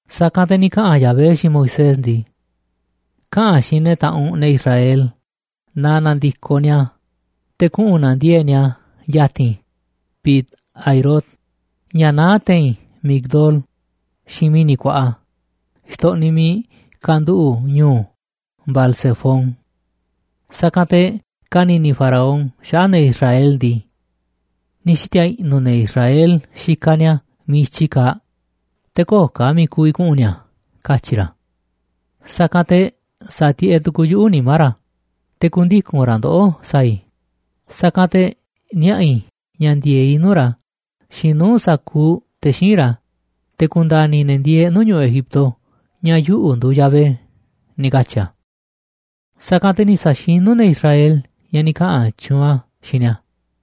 Sa̱kanꞌ te̱ ni̱ kaꞌa̱n Yahvé xiinꞌ Moisés ndii: ―Kaꞌa̱n xiinꞌ ne̱ taꞌanꞌ u̱nꞌ, ne̱ Israel, na na̱ndi̱koꞌ ni̱a̱ te̱ kuꞌu̱n na̱ndiee̱ꞌ ni̱a̱ ya̱ti̱n Pi-hahirot, ña̱ naá te̱i̱n Migdol xiinꞌ mi̱ni̱ kuaꞌa xtoꞌniꞌ miiꞌ kanduꞌu̱ꞌ ñu̱u̱ Baal-zefón. Sa̱kanꞌ te̱ ka̱ni̱ni̱ Faraón xaꞌa̱ꞌ ne̱ Israel ndii: “Ni̱ xiti̱a̱ i̱ꞌnu̱ ne̱ Israel xikaꞌ ni̱a̱ miiꞌ i̱tyi kaaꞌ, te̱ köo̱ꞌ ka̱ miiꞌ ku̱vi̱ kuꞌu̱n ni̱a̱”, katyi̱ ra̱. Sa̱kanꞌ te̱ sa̱tiꞌeꞌ tu̱ku̱u̱ yuꞌu̱ nimá ra̱, te̱ ku̱ndiku̱n ra̱ ndoꞌó sa̱a̱ i̱, sa̱kanꞌ te̱ niaꞌa̱ i̱ ña̱ ndi̱e̱eꞌ i̱ nuu̱ꞌ ra̱ xiinꞌ nuu̱ꞌ sa̱kuuꞌ te̱ xíinꞌ ra̱, te̱ ku̱nda̱ni̱ ne̱ ndieeꞌ nuu̱ꞌ ñu̱ꞌuꞌ Egipto ña̱ yuꞌu̱ nduuꞌ Yahvé ―ni̱ katyi̱ a̱. Sa̱kanꞌ te̱ ni̱ sa̱xinu̱ ne̱ Israel ña̱ ni̱ kaꞌa̱n tyuunꞌ a̱ xiinꞌ ni̱a̱.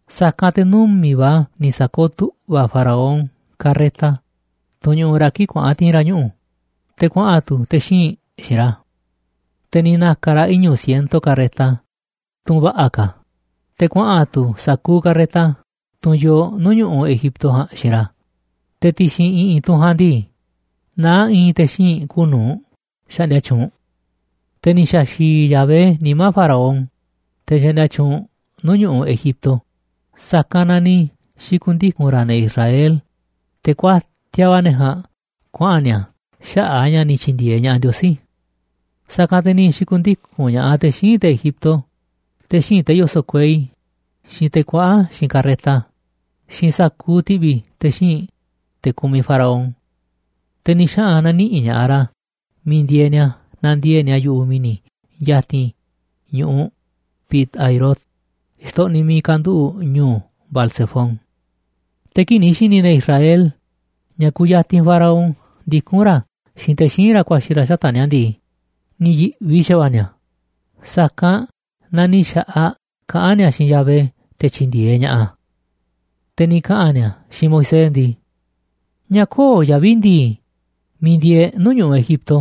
Sa̱kanꞌ te̱ numi̱ꞌ va̱ ni̱ sa̱kooꞌ tu̱ꞌva̱ Faraón carreta, tunꞌ ñuꞌuꞌ ra̱ kii̱ꞌ kuaꞌa̱n ti̱i̱n ra̱ ñuꞌu̱, te̱ kuaꞌa̱n tu̱ te̱ xíinꞌ xiinꞌ ra̱. Te̱ ni̱ na̱ka̱ ra̱ iñu̱ siento carreta, tunꞌ va̱ꞌa̱ ka̱, te̱ kuaꞌa̱n tu̱ sa̱kuuꞌ carreta, tunꞌ yoo nuu̱ꞌ ñu̱ꞌuꞌ Egipto ja̱a̱nꞌ, xiinꞌ ra̱, te̱ ti̱xi̱n i̱ꞌi̱n tunꞌ ja̱a̱nꞌ ndii, naá i̱i̱n te̱ xíinꞌ kuuꞌ nu̱uꞌ xaꞌndia tyuunꞌ. Te̱ ni̱ xa̱xi̱i̱ Yahvé nimá Faraón, te̱ xaꞌndia tyuunꞌ nuu̱ꞌ ñu̱ꞌuꞌ Egipto, sa̱kanꞌ na ni̱ xi̱ku̱ndiku̱n ra̱ ne̱ Israel, te̱ kuatiaꞌ va̱ ne̱ ja̱a̱nꞌ kuaꞌa̱n ni̱a̱ xaꞌa̱ꞌ a̱ ña̱ ni̱ tyi̱ndi̱e̱eꞌ ña̱ꞌaꞌ Ndiosí. Sa̱kanꞌ te̱ ni̱ xi̱ku̱ndiku̱n ña̱ꞌaꞌ te̱ xíinꞌ te̱ Egipto, te̱ xíinꞌ te̱ yoso̱ꞌ kuei, xiinꞌ te̱ kuaꞌa̱n xiinꞌ carreta, xiinꞌ sa̱kuuꞌ ti̱ꞌvi̱ te̱ xíinꞌ te̱ kumiꞌ Faraón. Te̱ ni̱ xaꞌa̱n na̱niꞌi̱ꞌ ña̱ꞌaꞌ ra̱ miiꞌ ndieeꞌ ni̱a̱ nandiee̱ꞌ ni̱a̱ yu̱ꞌuꞌ mi̱ni̱ ya̱ti̱n ñu̱ꞌuꞌ Pi-hahirot xtoꞌniꞌ miiꞌ kanduꞌu̱ꞌ ñu̱u̱ Baal-zefón. Te̱ kii̱ꞌ ni̱ xi̱ni̱ ne̱ Israel ña̱ kuyatinꞌ Faraón ndikún ra̱ xiinꞌ te̱ xíinꞌ ra̱ ku̱a̱xi̱ ra̱ xata̱ꞌ ni̱a̱ ndii, ni̱ yi̱ꞌvi xa̱va̱ꞌa̱ ni̱a̱, sa̱kanꞌ na ni̱ xa̱ꞌaꞌ kaꞌán ni̱a̱ xiinꞌ Yahvé te̱ tyi̱ndi̱e̱eꞌ ña̱ꞌaꞌ a̱. Te̱ ni̱ kaꞌa̱n ni̱a̱ xiinꞌ Moisés ndii: ―¿Ñáá köo̱ꞌ yavi̱ ndi̱i̱ miiꞌ ndiee̱ e̱ꞌ nuu̱ꞌ ñu̱ꞌuꞌ Egipto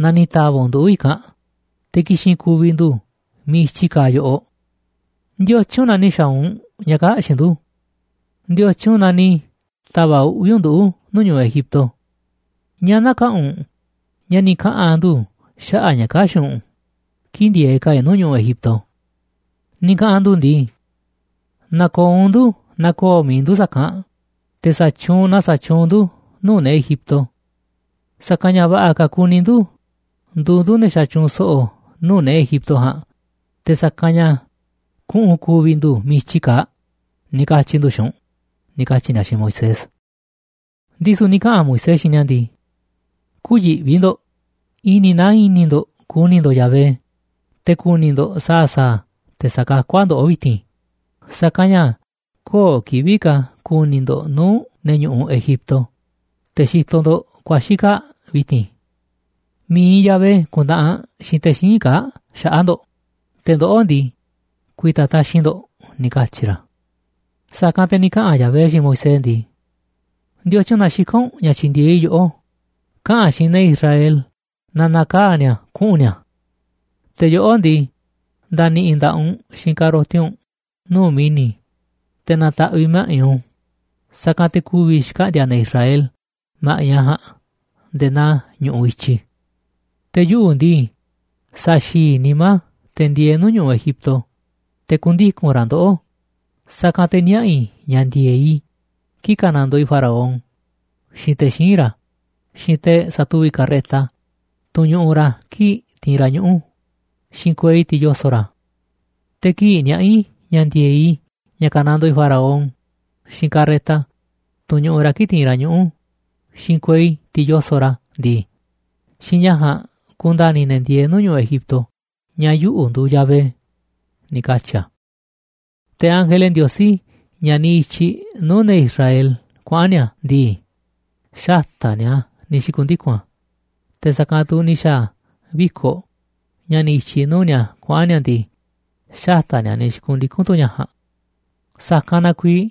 na ni̱ ta̱va̱ꞌ u̱nꞌ nduꞌu̱ i̱kanꞌ, te̱ ki̱xi̱n ku̱vi̱ ndu̱ miiꞌ i̱tyi kaaꞌ yoꞌoꞌ? ¿Ndiotyun na ni̱ xa̱a̱ u̱nꞌ ña̱ kaa̱ꞌ xiinꞌ ndu̱? ¿Ndiotyun na ni̱ ta̱va̱ꞌ uꞌvi̱ u̱nꞌ nduꞌu̱ nuu̱ꞌ ñu̱ꞌuꞌ Egipto? ¿Ñáá näkaꞌanꞌ u̱nꞌ ña̱ ni̱ kaꞌa̱n ndu̱ xaꞌa̱ꞌ ña̱ kaa̱ꞌ xiinꞌ u̱nꞌ kii̱ꞌ ndieeꞌ ka̱ e̱ꞌ nuu̱ꞌ ñu̱ꞌuꞌ Egipto? Ni̱ kaꞌa̱n ndu̱ ndii: “Na̱ko̱o̱ u̱nꞌ ndu̱ na ko̱o̱ mi̱iꞌ ndu̱ sa̱kanꞌ te̱ sa̱tyuunꞌ na sa̱tyuunꞌ ndu̱ nuu̱ꞌ ne̱ Egipto. Sa̱kanꞌ ña̱ va̱ꞌa̱ ka̱ kuni ndu̱ nduuꞌ ndu̱ ne̱ xatyuunꞌ so̱ꞌo̱ nuu̱ꞌ ne̱ Egipto ja̱a̱nꞌ, te̱ sa̱kanꞌ ña̱ kuꞌu̱n ku̱vi̱ ndu̱ miiꞌ i̱tyi kaaꞌ”, ni̱ katyi̱ ndu̱ xiinꞌ u̱nꞌ ―ni̱ katyi̱ ni̱a̱ xiinꞌ Moisés. Ndisu̱ ni̱ kaꞌa̱n Moisés xiinꞌ ni̱a̱ ndii: ―Kü̱yiꞌvi ndo̱ꞌ, i̱ni̱ naa i̱ni̱ ndo̱ꞌ ku̱ni̱ ndo̱ꞌ Yahvé, te̱ ku̱ni̱ ndo̱ꞌ sa̱a̱ sa̱a̱ a̱ te̱ sa̱kakú a̱ ndoꞌó vi̱ti̱n, sa̱kanꞌ ña̱ köo̱ꞌ kivi̱ꞌ ka̱ ku̱ni̱ ndo̱ꞌ nuu̱ꞌ ne̱ ñu̱ꞌuꞌ Egipto, te̱ xitoꞌ ndo̱ꞌ ku̱a̱xi̱ kaa̱ꞌ vi̱ti̱n. Mi̱iꞌ Yahvé ku̱ntaꞌanꞌ xiinꞌ te̱ xíinꞌ kaa̱ꞌ xaꞌa̱ꞌ ndo̱ꞌ, te̱ ndoꞌó ndii, ku̱i̱ta̱ taxi̱nꞌ ndo̱ꞌ ―ni̱ katyi̱ ra̱. Sa̱kanꞌ te̱ ni̱ kaꞌa̱n Yahvé xiinꞌ Moisés ndii: ―¿Ndiotyun na xikán u̱nꞌ ña̱ tyi̱ndi̱e̱eꞌ i̱ yoꞌó? Kaꞌa̱n xiinꞌ ne̱ Israel na na̱kaa̱ ni̱a̱ kuꞌu̱n ni̱a̱. Te̱ yoꞌó ndii, nda̱ni̱ꞌi̱ nda̱ꞌaꞌ u̱nꞌ xiinꞌ ka̱roti u̱nꞌ nuu̱ꞌ mi̱ni̱, te̱ na̱ta̱ꞌviꞌ ma̱ꞌiꞌ u̱nꞌ u̱nꞌ, sa̱kanꞌ te̱ ku̱vi̱ xkaꞌndi̱a̱ ne̱ Israel ma̱ꞌiꞌ a̱ ja̱a̱nꞌ nde̱e̱ naa ñu̱ꞌuꞌ i̱tyi. Te̱ yuꞌu̱ ndii, sa̱xi̱i̱ i̱ nimá te̱ ndieeꞌ nuu̱ꞌ ñu̱ꞌuꞌ Egipto, te̱ ku̱ndiku̱n ra̱ ndoꞌó, sa̱kanꞌ te̱ niaꞌa̱ i̱ ña̱ ndi̱e̱eꞌ i̱ kii̱ꞌ ka̱nandoo i̱ Faraón, xiinꞌ te̱ xíinꞌ ra̱, xiinꞌ te̱ sa̱tuvi̱ꞌ carreta, tunꞌ ñuꞌuꞌ ra̱ kii̱ꞌ tiinꞌ ra̱ ñuꞌu̱, xiinꞌ kuei, tiꞌ yoso̱ꞌ ra̱. Te̱ kii̱ꞌ niaꞌa̱ i̱ ña̱ ndi̱e̱eꞌ i̱ ña̱ ka̱nandoo i̱ Faraón, xiinꞌ carreta, tunꞌ ñuꞌuꞌ ra̱ kii̱ꞌ tiinꞌ ra̱ ñuꞌu̱, xiinꞌ kuei, tiꞌ yoso̱ꞌ ra̱ ndii, xiinꞌ ña̱ ja̱a̱nꞌ ku̱nda̱ni̱ ne̱ ndieeꞌ nuu̱ꞌ ñu̱ꞌuꞌ Egipto ña̱ yuꞌu̱ nduuꞌ Yahvé ―ni̱ katyi̱ a̱. Te̱ ángele Ndiosí ña̱ niꞌiꞌ i̱tyiꞌ nuu̱ꞌ ne̱ Israel kuaꞌa̱n ni̱a̱ ndii, xata̱ꞌ ni̱a̱ ni̱ xi̱ku̱ndiku̱n a̱, te̱ sa̱kanꞌ tu̱ ni̱ xa̱a̱ viko̱ꞌ ña̱ niꞌiꞌ i̱tyiꞌ nuu̱ꞌ ni̱a̱ kuaꞌa̱n ni̱a̱ ndii, xata̱ꞌ ni̱a̱ ni̱ xi̱ku̱ndiku̱n tu̱ ña̱ ja̱a̱nꞌ. Sa̱kanꞌ na kuiiꞌ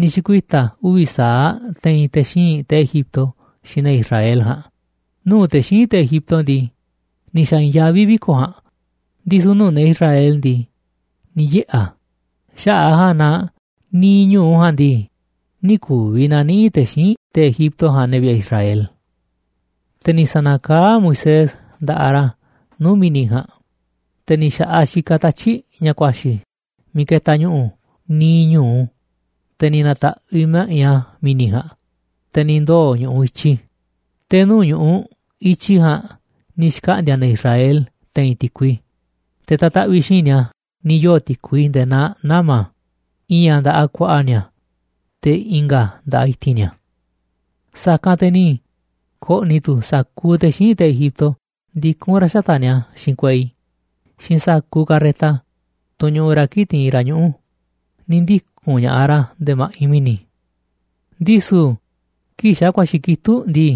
ni̱ xi̱kuita̱ uvi̱ sa̱aꞌ a̱ te̱i̱n te̱ xíinꞌ te̱ Egipto xiinꞌ ne̱ Israel ja̱a̱nꞌ nuu̱ꞌ te̱ xíinꞌ te̱ Egipto ndii, ni̱ xa̱ i̱i̱nyaví viko̱ꞌ ja̱a̱nꞌ, ndisu̱ nuu̱ꞌ ne̱ Israel ndii, ni̱ yiꞌe̱ a̱. Xaꞌa̱ꞌ a̱ ja̱a̱nꞌ na niiꞌ ñu̱u ja̱a̱nꞌ ndii, nï̱ ku̱vi̱ na̱niꞌi̱ꞌ te̱ xíinꞌ te̱ Egipto ja̱a̱nꞌ ne̱ vi̱ꞌe̱ Israel. Te̱ ni̱ sa̱na̱kaá Moisés nda̱ꞌaꞌ ra̱ nuu̱ꞌ mi̱ni̱ ja̱a̱nꞌ, te̱ ni̱ xa̱ꞌaꞌ xikaꞌ tatyi̱ꞌ ña̱ ku̱a̱xi̱ miiꞌ ketaꞌ ñu̱ꞌu̱ niiꞌ ñu̱u, te̱ ni̱ na̱ta̱ꞌviꞌ ma̱ꞌiꞌ a̱ mi̱ni̱ ja̱a̱nꞌ, te̱ ni̱ ndoo̱ ñu̱ꞌuꞌ i̱tyi, te̱ nuu̱ꞌ ñu̱ꞌuꞌ i̱tyi ja̱a̱nꞌ ni̱ xkaꞌndi̱a̱ ne̱ Israel te̱i̱n ti̱kui, te̱ ta̱taꞌviꞌ xiinꞌ ni̱a̱ ni̱ yoo̱ ti̱kui nde̱e̱ naa nama̱, i̱i̱n a̱ nda̱ꞌaꞌ ku̱a̱ꞌa̱ ni̱a̱, te̱ i̱nga̱ a̱ nda̱ꞌaꞌ i̱ti̱n ni̱a̱. Sa̱kanꞌ te̱ ni̱ ko̱ꞌni̱ tu̱ sa̱kuuꞌ te̱ xíinꞌ te̱ Egipto ndikún ra̱ xata̱ꞌ ni̱a̱ xiinꞌ kuei xiinꞌ sa̱kuuꞌ carreta, tunꞌ ñuꞌuꞌ ra̱ kii̱ꞌ tiinꞌ ra̱ ñuꞌu̱, ni̱ ndiku̱n ña̱ꞌaꞌ ra̱ nde̱e̱ ma̱ꞌiꞌ mi̱ni̱. Ndisu̱ kii̱ꞌ xa̱ ku̱a̱xi̱ kitúꞌ ndii,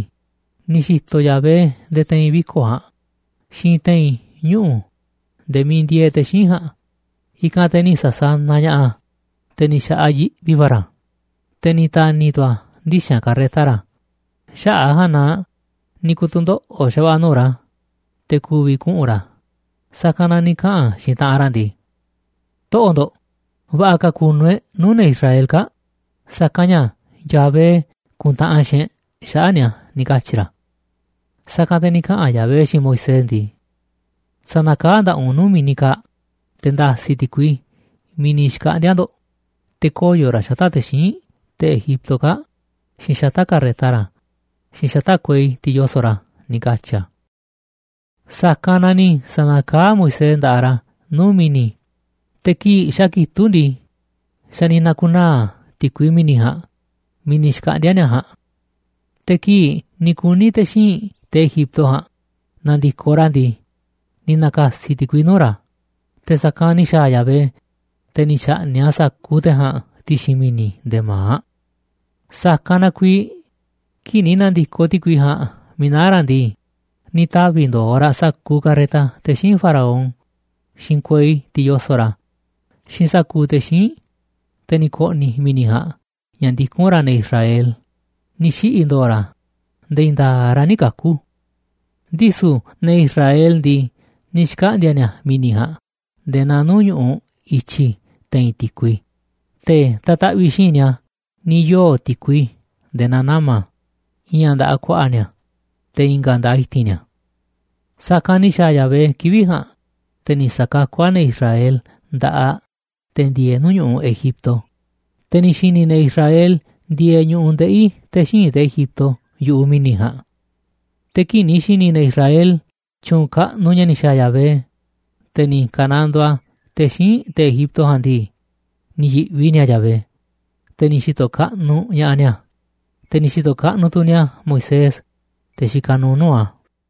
ni̱ xi̱to̱ Yahvé nde̱e̱ te̱i̱n viko̱ꞌ ja̱a̱nꞌ xiinꞌ te̱i̱n ñuꞌu̱ nde̱e̱ miiꞌ ndieeꞌ te̱ xíinꞌ ja̱a̱nꞌ, i̱kanꞌ te̱ ni̱ sa̱sanaꞌ ña̱ꞌaꞌ a̱, te̱ ni̱ xa̱ꞌaꞌ yiꞌvi va̱ ra̱, te̱ ni̱ ta̱ni̱ tu̱ a̱ ndixa̱nꞌ carreta ra̱, xaꞌa̱ꞌ a̱ ja̱a̱nꞌ na ni̱ ku̱tu̱ndoꞌo̱ꞌ xa̱va̱ꞌa̱ nuu̱ꞌ ra̱, te̱ ku̱vi̱ kuꞌu̱n ra̱, sa̱kanꞌ na ni̱ kaꞌa̱n xiinꞌ taꞌanꞌ ra̱ ndii: ―Toꞌo̱ꞌ ndo̱ꞌ, va̱ꞌa̱ ka̱ ku̱nu̱ e̱ꞌ nuu̱ꞌ ne̱ Israel kaa̱ꞌ, sa̱kanꞌ ña̱ Yahvé kuntaꞌanꞌ xiinꞌ e̱ꞌ xaꞌa̱ꞌ ni̱a̱ ―ni̱ katyi̱ ra̱. Sa̱kanꞌ te̱ ni̱ kaꞌa̱n Yahvé xiinꞌ Moisés ndii: ―Sa̱na̱kaá nda̱ꞌaꞌ u̱nꞌ nuu̱ꞌ mi̱ni̱ kaa̱ꞌ, te̱ nda̱si̱ ti̱kui miiꞌ ni̱ xkaꞌndi̱a̱ ndo̱ꞌ, te̱ koyo̱ raꞌ xata̱ꞌ te̱ xíinꞌ, te̱ Egipto kaa̱ꞌ, xiinꞌ xata̱ꞌ carreta ra̱, xiinꞌ xata̱ꞌ kuei, tiꞌ yoso̱ꞌ ra̱ ―ni̱ katyi̱ a̱. Sa̱kanꞌ na ni̱ sa̱na̱kaá Moisés nda̱ꞌaꞌ ra̱ nuu̱ꞌ mi̱ni̱, te̱ kii̱ꞌ xa̱ kitúꞌ ndii, xa̱ ni̱ na̱ku̱naa̱ ti̱kui mi̱ni̱ ja̱a̱nꞌ miiꞌ ni̱ xkaꞌndi̱a̱ ni̱a̱ ja̱a̱nꞌ. Te̱ kii̱ꞌ ni̱ kuni̱ te̱ xíinꞌ te̱ Egipto ja̱a̱nꞌ na̱ndi̱koꞌ ra̱ ndii, ni̱ na̱ka̱si̱ ti̱kui nuu̱ꞌ ra̱, te̱ sa̱kanꞌ ni̱ xa̱a̱ Yahvé, te̱ ni̱ xa̱ꞌni̱ꞌ a̱ sa̱kuuꞌ te̱ ja̱a̱nꞌ ti̱xi̱n mi̱ni̱ nde̱e̱ ma̱aꞌ. Sa̱kanꞌ na kuiiꞌ kii̱ꞌ ni̱ na̱ndi̱koꞌ ti̱kui ja̱a̱nꞌ miiꞌ naá ra̱ ndii, ni̱ tavi̱ ndo̱o̱ raꞌ sa̱kuuꞌ carreta te̱ xíinꞌ Faraón, xiinꞌ kuei, tiꞌ yoso̱ꞌ ra̱, xiinꞌ sa̱kuuꞌ te̱ xíinꞌ, te̱ ni̱ ko̱ꞌni̱ mi̱ni̱ ja̱a̱nꞌ ña̱ ndikún ra̱ ne̱ Israel, ni̱ xiꞌi̱ ndo̱o̱ ra̱ nde̱e̱ i̱i̱n nda̱a̱ꞌ ra̱ nï̱ kaku̱. Ndisu̱ ne̱ Israel ndii, ni̱ xkaꞌndi̱a̱ ni̱a̱ mi̱ni̱ ja̱a̱nꞌ nde̱e̱ naa nuu̱ꞌ ñu̱ꞌuꞌ i̱tyi te̱i̱n ti̱kui, te̱ ta̱taꞌviꞌ xiinꞌ ni̱a̱ ni̱ yoo̱ ti̱kui nde̱e̱ naa nama̱, i̱i̱n a̱ nda̱ꞌaꞌ ku̱a̱ꞌa̱ ni̱a̱, te̱ i̱nga̱ a̱ nda̱ꞌaꞌ i̱ti̱n ni̱a̱. Sa̱kanꞌ ni̱ xa̱a̱ Yahvé kivi̱ꞌ ja̱a̱nꞌ, te̱ ni̱ sa̱kakú a̱ ne̱ Israel nda̱ꞌaꞌ te̱ ndieeꞌ nuu̱ꞌ ñu̱ꞌuꞌ Egipto, te̱ ni̱ xi̱ni̱ ne̱ Israel ndieeꞌ ñu̱ꞌuꞌ ndeꞌi̱ te̱ xíinꞌ te̱ Egipto yu̱ꞌuꞌ mi̱ni̱ ja̱a̱nꞌ. Te̱ kii̱ꞌ ni̱ xi̱ni̱ ne̱ Israel tyu̱u̱n kaꞌnuꞌ ña̱ ni̱ xa̱a̱ Yahvé, te̱ ni̱ ka̱nandoo a̱ te̱ xíinꞌ te̱ Egipto ja̱a̱nꞌ ndii, ni̱ yi̱ꞌvi ni̱a̱ Yahvé, te̱ ni̱ xi̱to̱ kaꞌnuꞌ ña̱ꞌaꞌ ni̱a̱, te̱ ni̱ xi̱to̱ kaꞌnuꞌ tu̱ ni̱a̱ Moisés, te̱ xikaꞌ nuuꞌ nuu̱ꞌ a̱.